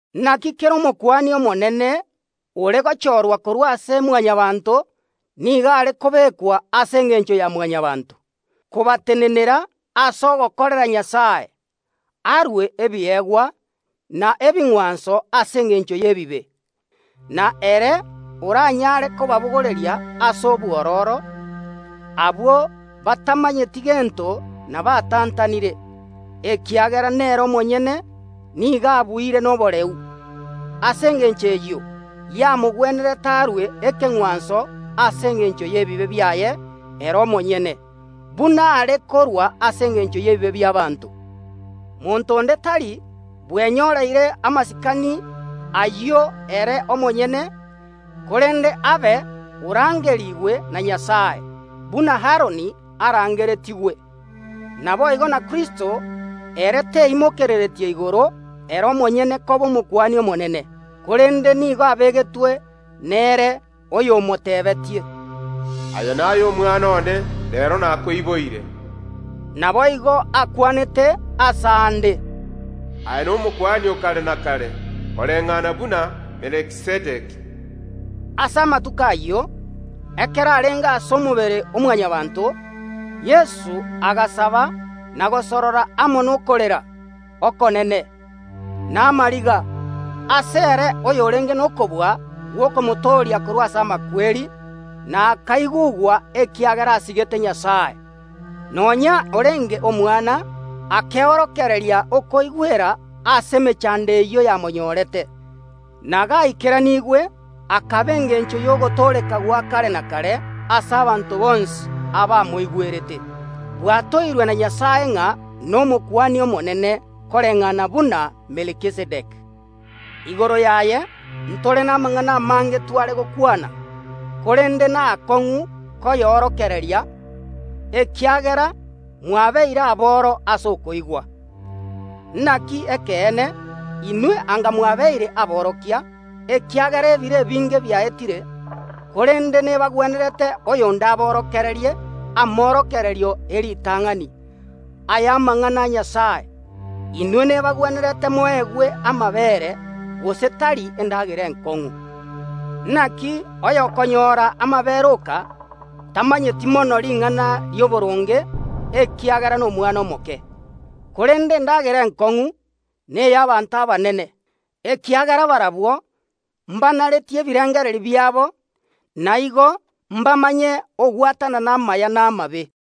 Naki kera Omokuani Omonene ore gochorwa korwa ase Mwanyabaanto nigo are kobekwa ase engencho ya Mwanyabaanto, kobatenenera ase ogokorera Nyasae, arue ebiegwa na ebing’wanso ase engencho y’ebibe. Na ere oranyare kobabogoreria ase obwororo abwo batamanyeti gento na batantanire, ekiagera nere omonyene nigo abuire noboreu. Ase engencho eyio yamogwenerete arue ekeng’wanso ase engencho y’ebibe biaye ere omonyene, buna are korua ase engencho y’ebibe bi’abaanto. Monto onde tari bwenyoreire amasikani ayio ere omonyene, korende abe orangerigwe na Nyasae, buna Aroni arangeretigwe. Naboigo na Kristo, ere teimokereretie igoro ere omonyene koba Omokuani Omonene, korende nigo abegetwe nere oyomotebetie, “Aye naye Omwana one, reero nakoiboire.” Naboigo akwanete aase aande, “Aye n’Omokuani o kare na kare, koreng’ana buna Melkizedeki.” Ase amatuko ayio, ekero arenge ase omobere o Mwanyabaanto, Yeso agasaba na gosorora amo nokorera okonene, na amariga, asere oyorenge nokobua gw’okomotooria korwa ase amakweri, na akaigugwa ekiagera asigete Nyasae. Nonya orenge Omwana akeorokereria okoigwera ase emechando eyio yamonyorete, na gaikeranigwe akaba engencho y’ogotooreka gwa kare na kare ase abanto bonsi abamoigwerete, bwatoirwe na Nyasae ng’a n’Omokuani Omonene, koreng’ana buna Melkizedeki. Igoro yaye ntore namang’ana amange tware gokwana korende naakong’u koyorokereria, ekiagera mwabeire aboro ase okoigwa. Naki ekeene, inwe anga mwabeire aborokia, ekiagera ebiro ebinge biaetire, korende nebagwenerete oyonde aborokererie amorokererio e ritang’ani ay’amang’ana a Nyasae. Inwe nebagwenerete moegwe amabeere, gose tari endagera enkong’u. Naki oyokonyora amabeere oka tamanyeti mono ring’ana ri’oboronge, ekiagera nomwana omoke. Korende endagera enkong’u ney’abaanto abanene, ekiagera barabwo mbanaretie ebirengererio biabo, na igo mbamanye ogwatanana amaya na amabe.